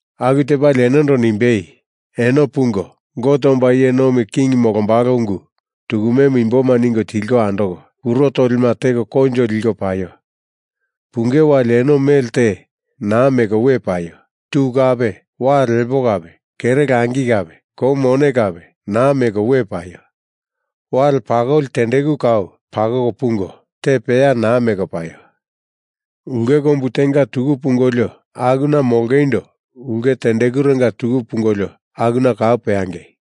Aku tepalie enondo nimbei, “Eno pungo, Gote omba iye nomi king molombalo ungu tukumemu imboma ningo tilko andoko, kuro tolima teko koinjo liko paio! Punge wali eno mele te naa meko we paio! Tu kape, wale lepo kape, kere langi kape, kou mone kape, naa meko we paio! Wale pakoli tendeku kau pakoko pungo, te peya naa meko we paio! Ulke kombu tenga tuku pungolio akuna molongeindo ulke tendekurenga tuku pungolio akuna kau peangei!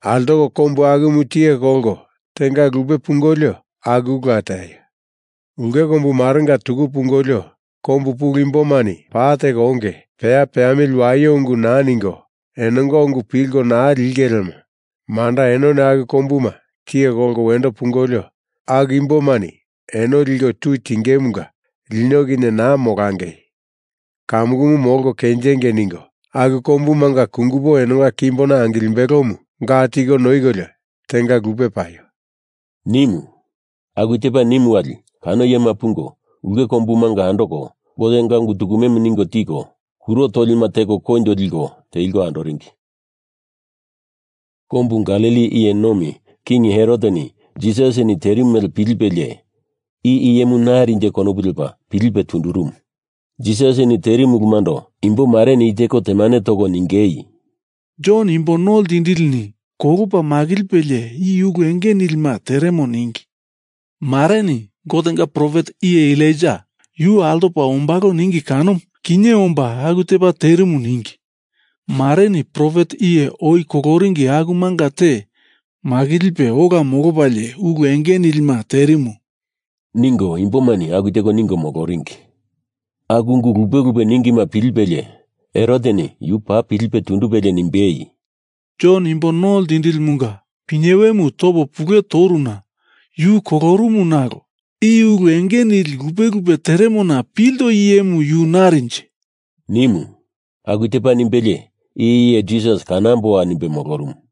Altoko kombu akumu tiye kolko tenga lupe pungolio akula teaio! Ulke kombu marenga tuku pungolio, kombu pulu imbomani paa teko onge, peya peamili waio ungu naa ningo enonga ungu pilko naa linge lemo manda enoni aku kombuma tiye kolko wendo pungolio, aku imbomani eno liko tui tingemunga lino kinye naa molangei, kamukumu molko kenjengei ningo, aku kombumanga kungupo enonga kimbona angilimbelomu ga tiko noikolio tenga lupe paio!” nimu. Aku tepa nimu wali kano iyema pungo, ulke kombumanga andoko, Gotenga ungu tukumemu ningo tiko, kuro tolima teko koinjo liko teliko andoringi. Kombu Galili iye nomi King Heroteni Jisasini terimu mele pilipelie, i iyemu narinje konopu lepa pilipe tundurumu. Jisasini terimu ulumundo imbomareni i teko temane toko ningei, “Jon Imbo No Ltindilini kolopa makilipelie i ulu enge nilima teremo ningi. Mareni, Gotenga profet iye Elaija, yu altopa ombalo ningi kanomu, kinye omba aku tepa terimu ningi. Mareni profet iye oi koloringi akumanga te makilipe ola molopalie ulu enge nilima terimu,” ningo imbomani aku teko ningo moloringi. Aku ungu lupe lupe ningima pilipelie Heroteni yu paa pilipe tundupelie nimbei, “Jon Imbo No Ltindilimunga pinyewemu topo pule toruna yu kolorumu nalo i ulu enge nili lupe lupe teremona pilto iyemu yu narinje?” nimu. Aku tepa nimbelie i iye Jisas kanamboa nimbe molorumu.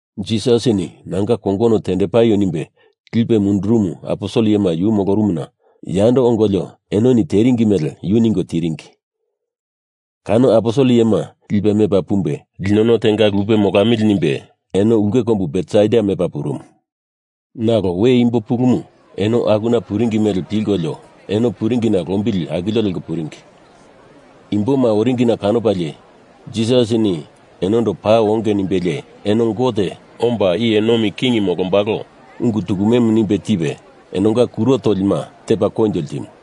Jisasini nanga kongono tendepaio nimbe lipe mundurumu aposel iyema yu molorumuna yando ongolio enoni teringi mele yu ningo tiringi. Kano aposel iyema lipe mepa pumbe linono tenga lupe molamili nimbe eno ulke kombu Betsaida mepa purumu. Nalo we imbo pulumu eno akuna puringi mele pilkolio eno puringina lombili akilio leko puringi. Imboma oringina kanopalie Jisasini enondo paa onge nimbelie eno Gote omba iye nomi king molombalo ungu tukumemu nimbe tipe enonga kuro tolima tepa koinjo ltimu.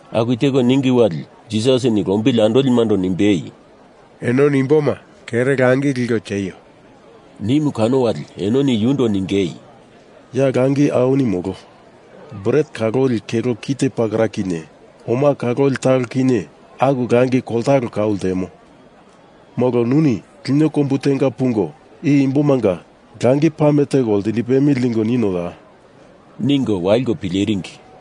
Aku teko ningi wali Jisasini lombili andolimando nimbei, “Enoni imboma kere langi liko tieio!” nimu kano wali enoni yundo ningei, “Ya langi awini molo. Bret kaloli kelo kite pakera kinye oma kaloli talo kinye aku langi koltalo kau ltemo. Molo nuni lino kombu tenga pungo i imbomanga langi pame toko lindipemili ningo ninoya?” ningo waliko pileringi.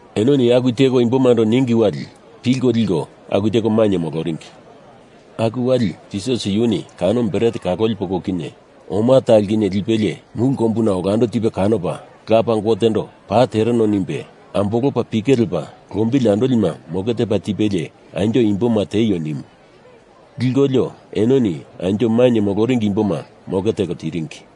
Enoni aku teko imbomando ningi wali pilko liko aku teko mainye moloringi. Aku wali Jisas yuni kano bret kaloli poko kinye oma talo kinye lipelie mulu kombuna olando tipe kanopa, Lapa Gotendo paa tereno nimbe, ambolopa pike lepa, lombili andolima moke tepa tipelie anjo imboma tieio nimu. Likolio, enoni anjo mainye moloringi imboma moke teko tiringi.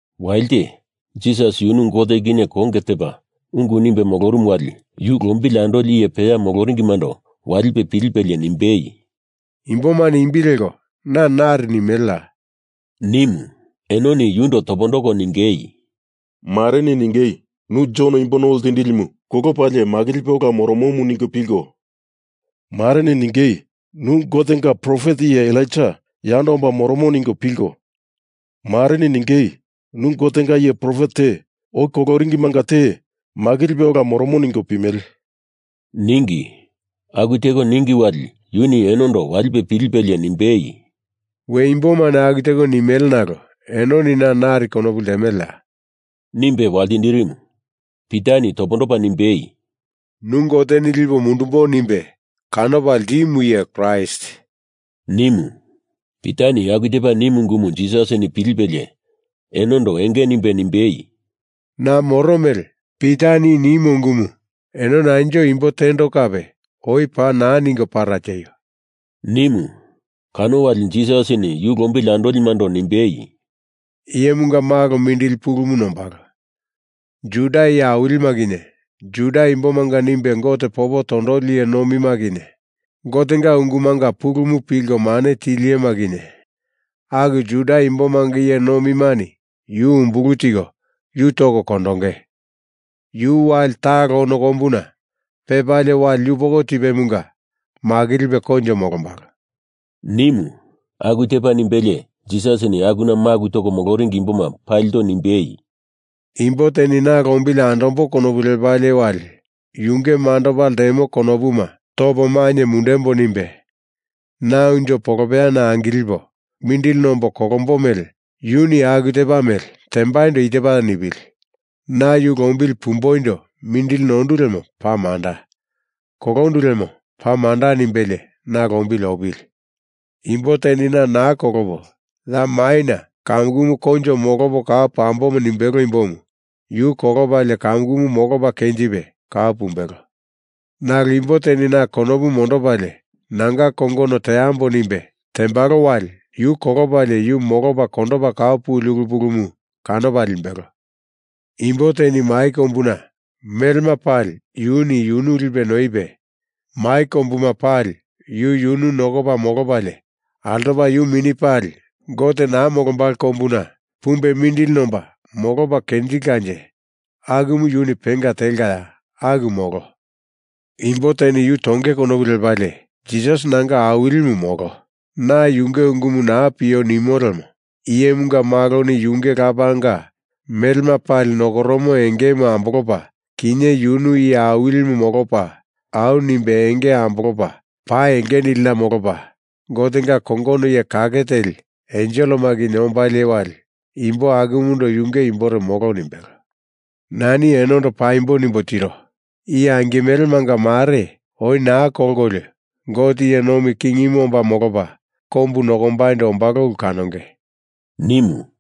Walite, Jisas yunu Gote kinye konge tepa ungu nimbe molorumu wali yu lombili andoli iye peya moloringimando walipe pilipelie nimbei, “Imbomani imbi leko na nari nimeleya?” nimu. Enoni yundo topondoko ningei, “Mareni ningei nu Jon Imbo No Ltindilimu kolopalie makilipe ola moromomu ningo pilko, mareni ningei nu Gotenga profet iye Elaija yando omba moromo ningo pilko, mareni ningei nu Gotenga iye profet te oi koloringimanga te makilipe ola moromo ningo pimele,” ningi. Aku teko ningi wali yuni enondo walipe pilipelie nimbei, “We imbomani aku teko nimele nalo enoni na nari konopu ltemeleya?” nimbe waltindirimu. Pitani topondopa nimbei, “Nu Goteni lipo mundumbo nimbe kanopa ltimu iye Kraist,” nimu. Pitani aku tepa nimu ungumu Jisasini pilipelie enondo enge nimbe nimbei, “Na moro mele Pitani i nimo ungumu enoni anjo imbo tendo kape oi paa naa ningo para tieio!” nimu. Kano wali Jisasini yu lombili andolimando nimbei, “Iyemunga Malo mindili pulumu nombalo. Juda iye awilima kinye, Juda Imbomanga nimbe Gote popo tondoli iye nomima kinye, Gotenga ungumanga pulumu pilko mane tili iyema kinye, aku Juda imbomanga iye nomimani yu umbulu tiko yu toko kondonge. Yu wali talo ono kombuna pepalie wali yupoko tipemunga makilipe koinjo molombalo,” nimu. Aku tepa nimbelie Jisasini akuna maku toringi imboma palindo nimbei, “Imbo teni Na lombili andambo konopu lepalie wali, yunge mandopa ltemo konopuma topo mainye mundembo nimbe, na unjo polopeyana angilipo mindili nombo kolombo mele yuni aku tepa mele tembaindo i tepa nipili: Na yu lombili pumboindo mindili nondu lemo paa manda, kolondu lemo paa manda nimbelie na lombili opili! Imbo teni na naa kolopo, ya maina kamukumu koinjo molopo kau pambo nimbelo imbomu yu kolopalie kamukumu molopa kenjipe kau pumbelo. Nalo imbo teni na konopu mondopalie nanga kongono teambo nimbe tembalo wali yu kolopalie yu molopa kondopa kau puli ulu pulumu kanopa limbelo. Imbo teni mai kombuna melema pali yuni yunu lipe noipe mai kombuma pali yu yunu nokopa molopalie altopa yu mini pali Gote naa molombalo kombuna pumbe mindili nomba molopa kenjilkanje akumu yuni penga telkaya? Aku molo. Imbo teni yu tonge konopu lepalie Jisas nanga Awilimu molo, na yunge ungumu naa pio nimo lemo Iyemunga Maloni yunge Lapanga melema pali nokoromo engemu ambolopa kinye yunu Iye Awili molopa au nimbe enge ambolopa pa enge nilina molopa Gotenga kongono iye kake teli enselema kinye ombalie wali imbo akumundo yunge imbore molo nimbelo. Nani enondo paimbo nimbo tiro. I angimelemanga mare oi naa kolkolio Gote iye nomi kingimu omba molopa kombu nokombaindo ombalo ulu kanonge,” nimu.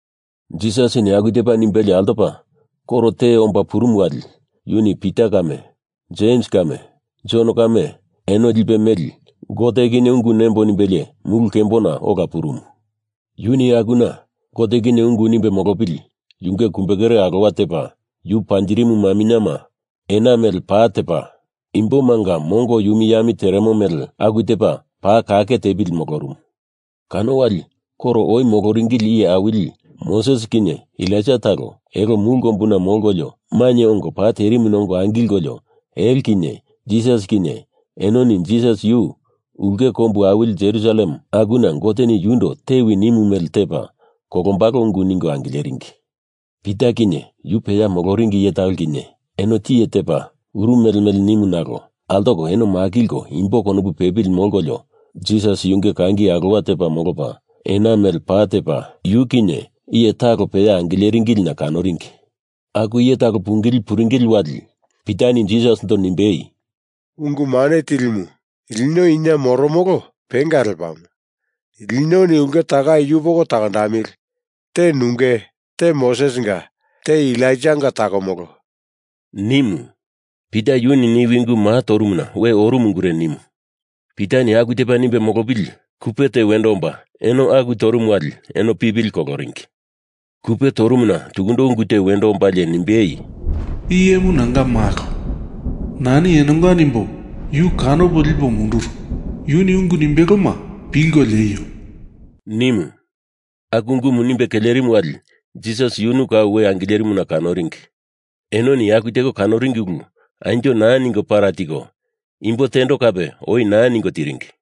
Jisasini aku tepa nimbelie altopa koro te omba purumu wali yuni Pita kame, Jems kame, Jon kame, eno lipe meli Gote kinye ungu nembo nimbelie mulu kembona ola purumu. Yuni akuna Gote kinye ungu nimbe molopili yunge kumbekere alowa tepa yu panjirimu maminyema ena mele pa tepa imbomanga mongo yumi yami teremo mele aku tepa paa kake tepili molorumu. Kano wali koro oi moloringili iye awili, Moses kinye Elaija talo, elo mulu kombuna molkolio mainye ongo pa terimuna ongo angilkolio elo kinye Jisas kinye enoni Jisas yu ulke kombu awili Jerusalem akuna Goteni yundo tewi nimu mele tepa kolombalo ungu ningo angileringi. Pita kinye, yu peya moloringi iye talo kinye, eno tiye tepa uru mele mele nimu nalo altoko eno makilko imbo konopu pepili molkolio Jisas yunge kangi alowa tepa molopa, ena mele pa tepa, yu kinye iye talo peya angileringilina kanoringi. Aku iye talo pungili puringili wali Pitani Jisasindo nimbei, “Ungu Mane Tilimu, lino ina moromolo penga lepamo. Linoni ulke takai yupoko takondamili! Te nunge, te Mosesinga, te Elaijanga takomolo!” nimu. Pita yuni niwi ungu maa toromona we orumu ungure nimu. Pitani aku tepa nimbe molopili kupe te wendo omba eno aku torumu wali eno pipili koloringi. Kupe torumuna tukundo ungu te wendo ombalie nimbei, “I iyemu nanga malo. Nani enonga nimbo yu kanopo lipo munduru. Yuni ungu nimbeloma pilko lieio!” nimu. Aku ungumu nimbe kelerimu wali Jisas yunu kau we angilerimuna kanoringi. Enoni aku teko kanoringi ulu anjo naa ningo para tiko, imbo tendo kape oi naa ningo tiringi.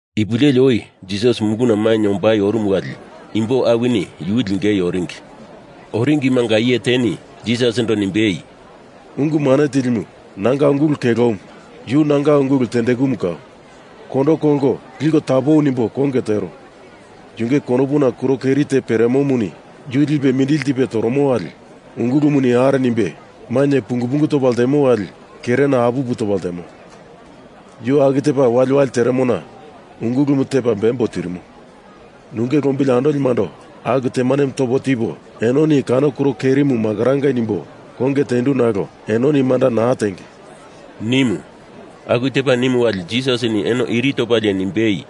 Ipu leli oi Jisas muluna mainye ombai orumu wali imbo awini yu lingei oringi. Oringimanga iye teni Jisasindo nimbei, “Ungu Mane Tilimu, nanga ungulu kelomu, yu nanga ungulu tendekumu kau, kondo kolko liko tapowi nimbo konge tero. Yunge konopuna kuro keri te peremomuni yu lipe mindili tipe toromo wali ungulumuni are nimbe, mainye pungu pungu topa ltemo wali kerena apupu topa ltemo. Yu aku tepa waliwali teremona ungulumu tepa bembo tirimo. Nunge lombili andolimando aku temanemu topo tipo enoni kano kuro kerimu makorangei nimbo konge tendu nalo eno manda naa tenge,” nimu. Aku tepa nimu wali Jisasini eno iri topalie nimbei,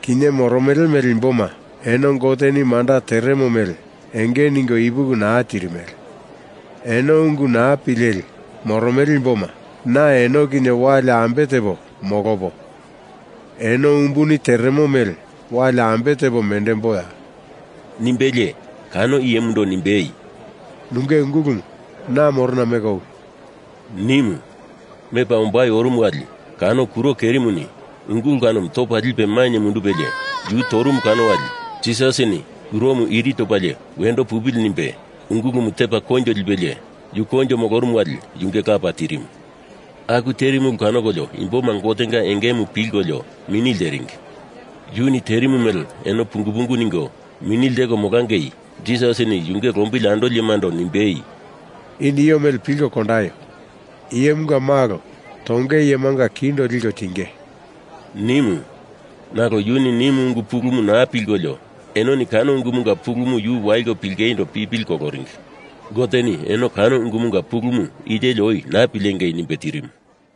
“Kinye moromele imboma eno Goteni manda teremo mele enge ningo ipuki naa tirimele. Eno ungu naa pileli moromele imboma, na eno kinye wali ambe tepo molopo, eno umbuni teremo mele wali ambe tepo mendemboa,” nimbelie, kano iyemundo nimbei, “Nunge ungulumu na morona meko owi!” nimu. Mepa ombai orumu wali kano kuro kerimuni ungulu kanomu topa lipe mainye mundupelie yu torumu kano wali Jisasini kuromu iri topalie wendo pupili nimbe ungulumu tepa koinjo lipelie, yu koinjo molorumu wali yunge lapa tirimu. Aku terimu ulu kanokolio imboma Gotenga engemu pilkolio mini lteringi. Yuni terimu mele eno pungu pungu ningo mini lteko molangei Jisasini yunge lombili andolimando nimbei, “I nio mele pilko kondaio! Iyemunga Malo tonge iyemanga kindo liko tinge,” nimu. Nalo yuni nimu ungu pulumu naa pilkolio enoni kano ungumunga pulumu yu waliko pilingeindo pipili koloringi. Goteni eno kano ungumunga pulumu i teli oi naa pilengei nimbe terimu.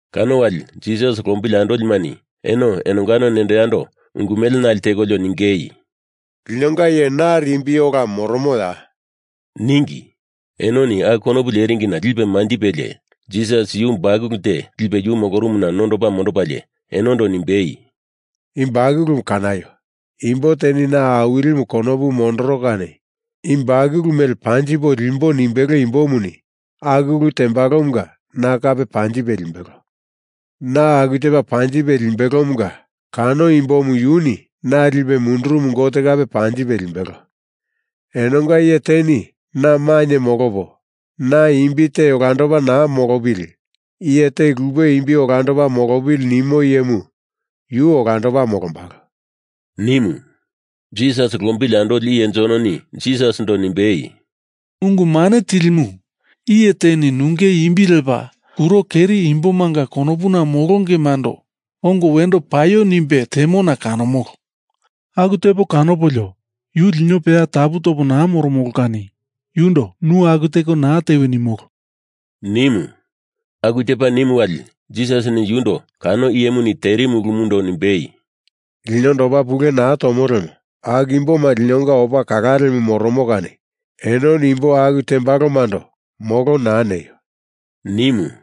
Kano wali Jisas lombili andolimani eno enongano nendo yando ungu mele nale tekolio ningei, “Linonga iye nari imbi ola moromoya?” ningi. Enoni aku konopu leringina lipe manjipelie, Jisas yu bakulu te lipe yu molorumuna nondopa mondopalie enondo nimbei, “I bakulumu kanaio! Imbo teni na Awilimu konopu mondoro kani i bakulu mele panjipo limbo nimbelo imbomuni aku ulu tembalomunga na kape panjipe limbelo. Na aku tepa panjipe limbelomunga kano imbomu yuni na lipe mundurumu Gote kape panjipe limbelo. Enonga iye teni na mainye molopo, na imbi te olandopa naa molopili! Iye te lupe imbi olandopa molopili nimo iyemu yu olandopa molombalo,” nimu. Jisas lombili andoli iye Jononi Jisasindo nimbei, “Ungu Mane Tilimu, iye teni nunge imbi lepa kuro keri imbomanga konopuna molongemando ongo wendo paio nimbe temona kanomolo. Aku tepa kanopolio yu lino peya tapu topo naa moromolo kani yundo nu aku teko naa tewi nimolo,” nimu. Aku tepa nimu wali Jisasini yundo kano iyemuni terimu ulumundo nimbei, “Linondo opa pule naa tomo lemo aku imboma linonga opa kalalemu moromo kani enoni imbo aku tembalomando molo naa neio,” nimu.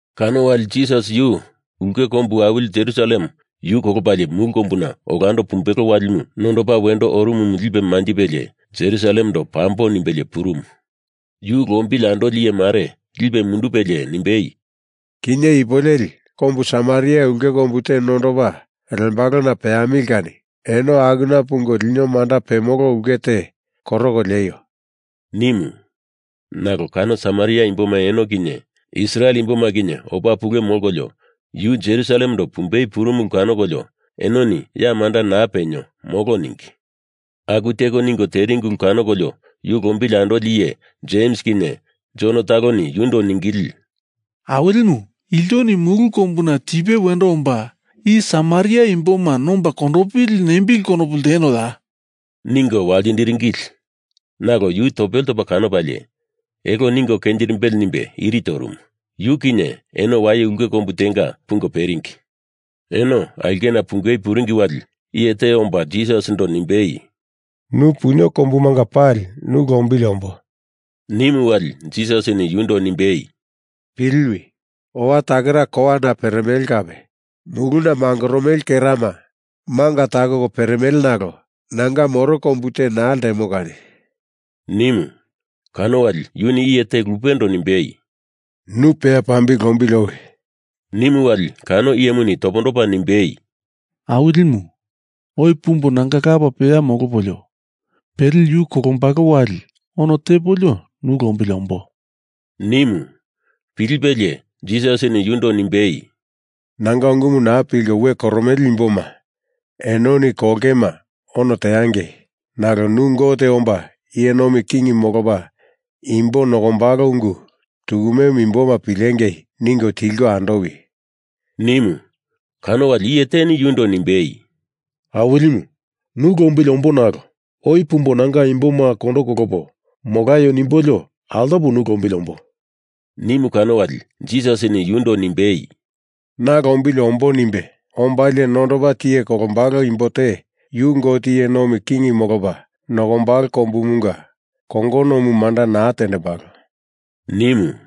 Kano wali Jisas ulke kombu awili Jerusalem yu kolopalie mulu kombuna olando pumbelo walimu nondopa wendo orumu lipe manjipelie Jerusalemando pambo nimbelie purumu. Yu lombili andoli iye mare lipe mundupelie nimbei, “Kinye ipu leli kombu Samaria ulke kombu te nondopa lembalona peamili kani eno akuna pungo lino manda pemolo ulke te koroko lieio,” nimu. Nalo kano Samaria imboma eno kinye Israel imboma kinye opa pule molkolio yu Jerusalemendo pumbei purumu ulu kanokolio enoni ya manda naa penio, molo ningi. Aku teko ningo teringi ulu kanokolio yu lombili andoli iye Jems kinye Jon taloni yundo ningili, “Awilimu, iltoni mulu kombuna tipe wendo omba i Samaria Imboma nomba kondopili nembili konopu ltenoya?” ningo waltindiringili. Nalo yu topele topa kanopalie, elo ningo kenjirimbele nimbe iri torumu. Yu kinye eno waye ulke kombu tenga pungo pepuringi. Eno aulkena pungei puringi wali iye te omba Jisasindo nimbei, “Nu punio kombumanga pali nu lombili ombo,” nimu wali Jisasini yundo nimbei, “Piliwi! Owa takera kowana peremele kape, muluna mangoromele kerama manga takoko peremele nalo nanga moro kombu te naa ltemo kani!” nimu. Kano wali yuni iye te lupendo nimbei, “Na peya pambili lombili owi,” nimu wali kano iyemuni topondopa nimbei, “Awilimu, oi pumbo nanga lapa peya molopolio pele yu kolombalo wali ono tepolio nu lombili ombo,” nimu. Pilipelie Jisasini yundo nimbei, “Nanga ungumu naa pilko we koromele imboma enoni kolongema ono teangei nalo nu Gote omba iye nomi king molopa imbo nokombalo ungu tukumemu imboma pilengei ningo tilko andowi!” nimu. Kano wali iye teni yundo nimbei, “Awilimu, nu lombili ombo nalo oi pumbo nanga imboma kondo kolopo molaio nimbolio altopo nu lombili ombo,” nimu kano wali Jisasini yundo nimbei, “Na lombili ombo nimbe ombalie nondopa tiye kolombalo imbo te yu Gote iye nomi king molopa nokombalo kombumunga kongonomu manda naa tembalo,” nimu.